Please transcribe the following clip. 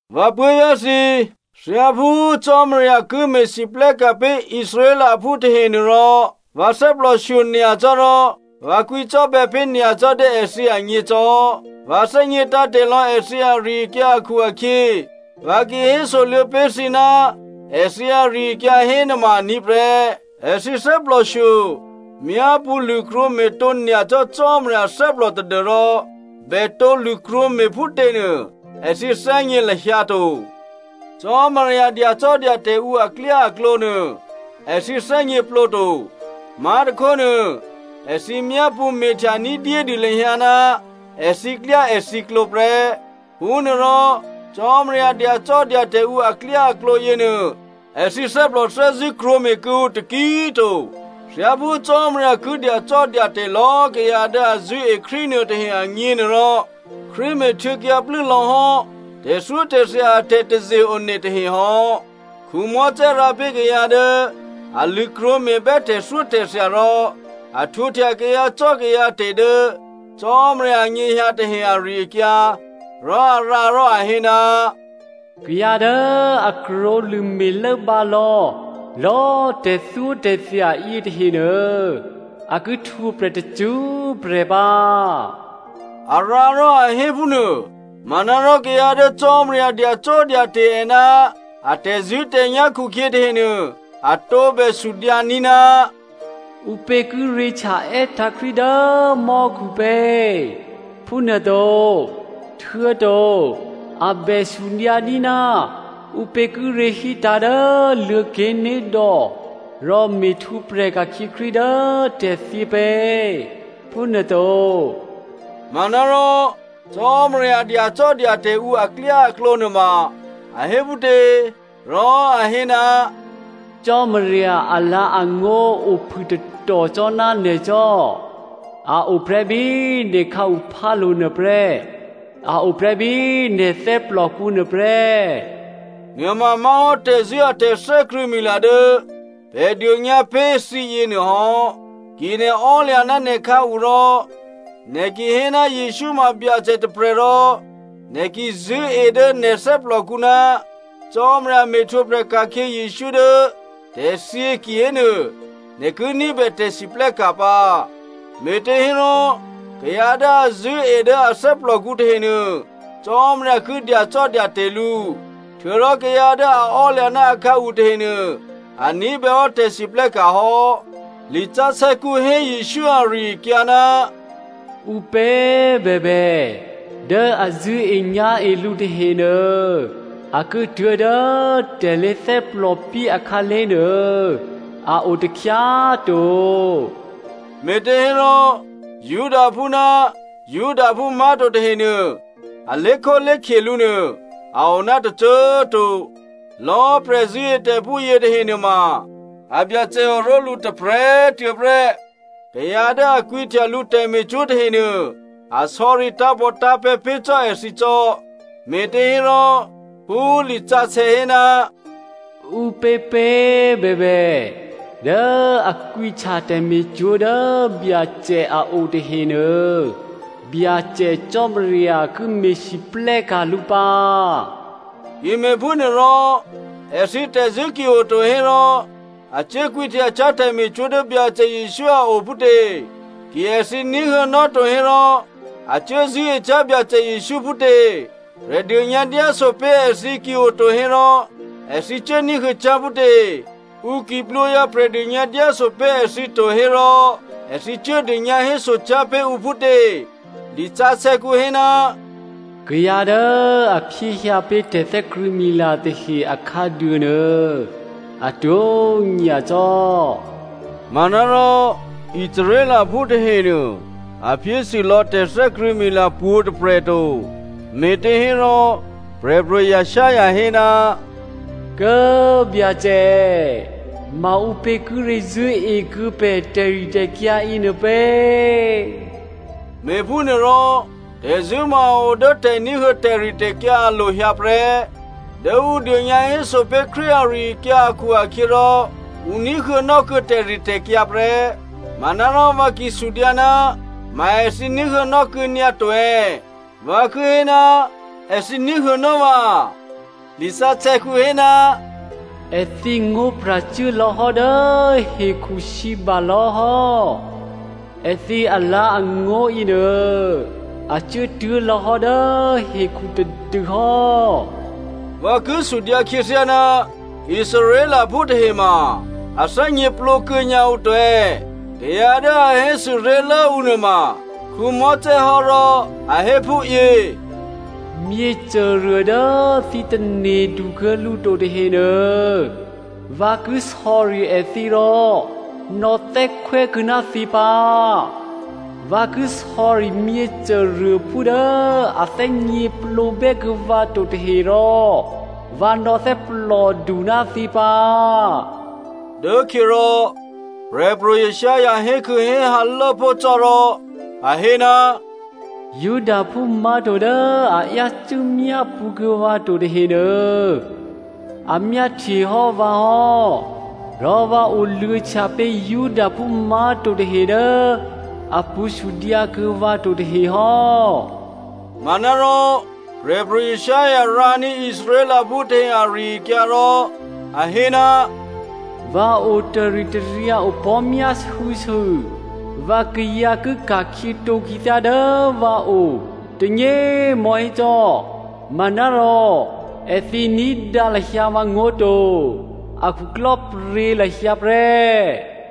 Vǎ puố̤vyá̤ thǐ꤮, thyáphú Cò́marya ki me̤lwóhteka̤ pé̤ Israelphú tahenuôrò, vǎ thè́plòshyo nyacò́ rò vǎ kwǐcò́bè̌ pé̤ nyacò́ dố èthǐ agně cò́. Vǎ thè́gně tǎ̤te̤ lò̌ èthǐ ari-akyǎ akhu-akhyě, vǎ ki hésoluô̌ pé̤ thǐ ná èthǐ ari-akyǎ hénuôma aní̤ prè́. Èthǐ thè́plòshyo myápṳ̌ lṳ̂krwǒ me̤tǒ nyacò́ Cò́marya thè́plò tadû́rò bètǒ lṳ̂krwǒ me̤ phútěnuô èthǐ thè́gně lahyǎ to. Cò́marya dyacò́dyate̤ ǔ aklyáaklǒ nuô èthǐ thè́gněplǒ to. Má̤tôkhónuô, èthǐ myápṳ̌ me̤htya ní̤dyédû lahyǎ ná èthǐklyáèthǐklǒ prè́. Phúnuôrò Cò́marya dyacò́dyate̤ ǔ aklyáaklǒ yěnuô èthǐ thè́plòthè́zṳ̂́ krwǒme̤ kuô̌ǔ taki꤮ to. Thyáphú Cò́marya ki dyacò́dyate̤ lò̌ kayǎ dố a zṳ̂́e Krístu nuôtahe agněnuôrò, Krístu me̤htuô̌kyǎ plû́lò̌hò́ tè̤thyótè̤thya a tè̤taze-one tahe hò́. Mosè rǎ pé̤ kayǎ dố a lṳ̂krwǒ me̤bè́ tè̤thyótè̤thya rò a htwǒhtya kayǎcò́kayǎte̤ dố Cò́marya anyěhyǎ tahe ari-akyǎ, rò a rǎ rò a hé, “Kayǎ dố a krwǒlṳ̂me̤ lốbǎ lò̌lò̌꤮ tè̤thyótè̤thya yětahenuô, a ki htwǒprè̤ tacṳ́prè̤ pǎ,” a rǎ rò a hé phúnuô. Manárò kayǎ dố Cò́marya dyacò́dyate̤ è ná a tè̤zṳ̂́tè̤nyá̤ khukhyě tahenuô, a tǒbè sudyǎní̤, “Ǔpě kíré̤ htya (È́tǎ̤ Krístu) dố mò́khupě?” phúnuôto. Htuô̌to a bè sudyǎní̤, “Ǔpě kíré̤ hítǎ̤ dố Luô̤̌ké̤nédò̌ (Rò me̤htwǒprè̤ ka̤khyě Krístu dố tè̤thyě) pě?” phúnuôto. Manárò, Cò́marya dyacò́dyate̤ ǔ aklyáaklǒ nuôma a hé phútě? Rò a hé, “Cò́marya alǎ̤angó̤ ophû tatò cò́ ná nè̤ cò́. A o prè́ bí nè̤ khǎuphálo̤nuô prè́, a o prè́ bí nè̤ thè́plòkǔ nuôprè́.” Nuôma má̤hò́ tè̤zṳ̂́ a tè̤thè́krṳ̂̌mila dố pè̤ dônyǎ pé̤ thǐyě nuôhò́. Ki nè̤ ò́lya̤ ná nè̤khǎu rò nè̤ ki hé ná Jesǔ ma Byacè tôprè̤ rò nè̤ ki zṳ̂́e dố nè̤ thè́plòkǔ ná Cò́marya me̤htwǒprè̤ ka̤khyě Jesǔ dố tè̤thyě kihénuô, nè̤ ki ní̤bè tè̤siplè́ka̤ pǎ. Me̤těhérò, kayǎ dố a zṳ̂́e dố a thè́plòkǔ tahenuô, Cò́marya ki dyacò́dyate̤ lǔ. Htuô̌rò kayǎ dố a ò́lya̤ ná akhǎu tahenuô, a ní̤bèhò́ tè̤siplè́ka̤ hò́. Lisǎsè̌kǔ hé Jesǔ ari-akyǎ, “Ǔpě bèbè, dố a zṳ̂́enyá̤e lǔ tahenuô, a ki tuố̤dố tè̤ lé̤thè́plòpyé akhǎlé̤ nuô a o takhyá꤮ to.” Me̤těhérò Judaphú ná Judaphú má̤to tahenuô a lé̤khólé̤khye lǔnuô, a o ná tôcô꤮ to. Lò̌꤮ prè̤ zṳ̂́etè̤phú yětahe nuôma a Byacè oró̤lǔ tôprè̤꤮ tuô̌ prè́. Kayǎ dố a kwǐhtya lǔ tè̤me̤cwó̤ tahenuô, a sò̌ri tǎ̤pòtǎ̤pè̤̌ pé̤ cò́ èthǐ cò́. Me̤těhérò, phú lisǎsè̌ hé, “Ǔpěpě꤮ bèbè dố a kwǐhtya tè̤me̤cwó̤ dố Byacè a o tahenuô, Byacè Cò́marya ki me̤lwóhteka̤ lǔ pǎ.” Ki me̤phúnuôrò, èthǐ tè̤zṳ̂́ ki oto hérò a cuố kwǐhtyacyá̤ tè̤me̤cwó̤ dố Byacè Jesǔ a o phútě? Ki èthǐ ní̤huô̌nò́ to hérò a cuố zṳ̂́ecyá̤ Byacè Jesǔ phútě? Prè̤dônyǎdyáso pé̤ èthǐ ki oto hérò èthǐ cuốní̤huô̌cyá̤ phútě? Ǔ ki plwǒhyǎ prè̤dônyǎ dyáso pé̤ èthǐ to hérò èthǐ cuố dônyǎ hésocyá̤ pé̤ ǔ phútě? Lisǎsè̌kǔ hé, “Kayǎ dố a phyéhyǎ pé̤ tè̤thè́krṳ̂̌mila tahe akhǎduô nuô atwó̤ nyacò́.” Manárò Israelphú tahenuô a phyésûlò̌ tè̤thè́krṳ̂̌mila pwǒ̤꤮ tôprè̤ to. Me̤těhérò, Prè̤pro̤ Isaiah hé, “Kố꤮ Byacè, maǔpě kíré̤ zṳ̂́ekuô̌ pè̤ tè̤ritè̤kyǎ yěnuô pě?” Me̤phúnuôrò, tè̤zṳ̂́ ma a o dố tè̤ní̤huô̌ tè̤ritè̤kyǎ alo̤ hyǎ prè́. Dố ǔ dônyǎhéso pé̤ Krístu ari-akyǎ akhu-akhyěrò, ǔ ní̤huô̌nò́ kuô̌ tè̤ritè̤kyǎ prè́. Manárò vǎ ki sudyǎ, “Ma èthǐ ní̤huô̌nò́ kuô̌ nyǎto è̌?” Vǎ ki hé, èthǐ ní̤huô̌nò́ vǎ. Lisǎsè̌kǔ hé, “Èthǐ ngó̤pra̤ cuố lò̌hò́ dố hekhusǐbalò̌ hò́. Èthǐ alǎ̤angó̤ yěnuô a cuốtuố̤ lò̌hò́ dố hekhu tadû hò́.” Vǎ ki sudyǎ khyěthyá, Israelphú tahe ma a thè́gněplǒkuô̌ nyǎ ǔ to è̌? Kayǎ dố a hésû ré̤lố ǔ nuôma Mosè hò́ rò a hé phúyě, “Myěcôruô dố thǐ tane̤du kuô̌ lǔ to tahenuô, vǎ ki sò̌ri èthǐ rò nò̌thè́khwè́kuô̌ ná thǐ pǎ. Vǎ ki sò̌ri myěcôruôphú dố a thè́gněplǒbè́ kuô̌ vǎ to tahe rò vǎ nò̌thè́plòdu ná thǐ pǎ.” Dốkhyě rò Prè̤pro̤ Isaiah hékhû̌héhǎ lốpó̤ cò́ rò a hé, “Judaphú má̤to dố a yácû́ myápṳ̌kuô̌ vǎ to tahenuô, a myáhtyehò́ vǎ hò́, rò vǎ oluô̌htya pé̤ Judaphú má̤to tahe dố a pṳ̌ sudyǎkuô̌ vǎ to tahe hò́.” Manárò, Prè̤pro̤ Isaiah rǎní̤ Israelphú tahe ari-akyǎ rò a hé, “Vǎ o taritaryǎ opò̤́myásû̌sû vǎkayǎ ki ka̤khyětǒ khyěthyá dố vǎo tônyě꤮ mò̤́hé cò́, manárò èthǐ ní̤dǎ lahyǎ vǎngó̤ to, a khuklò́pryě̤ lahyǎ prè́.”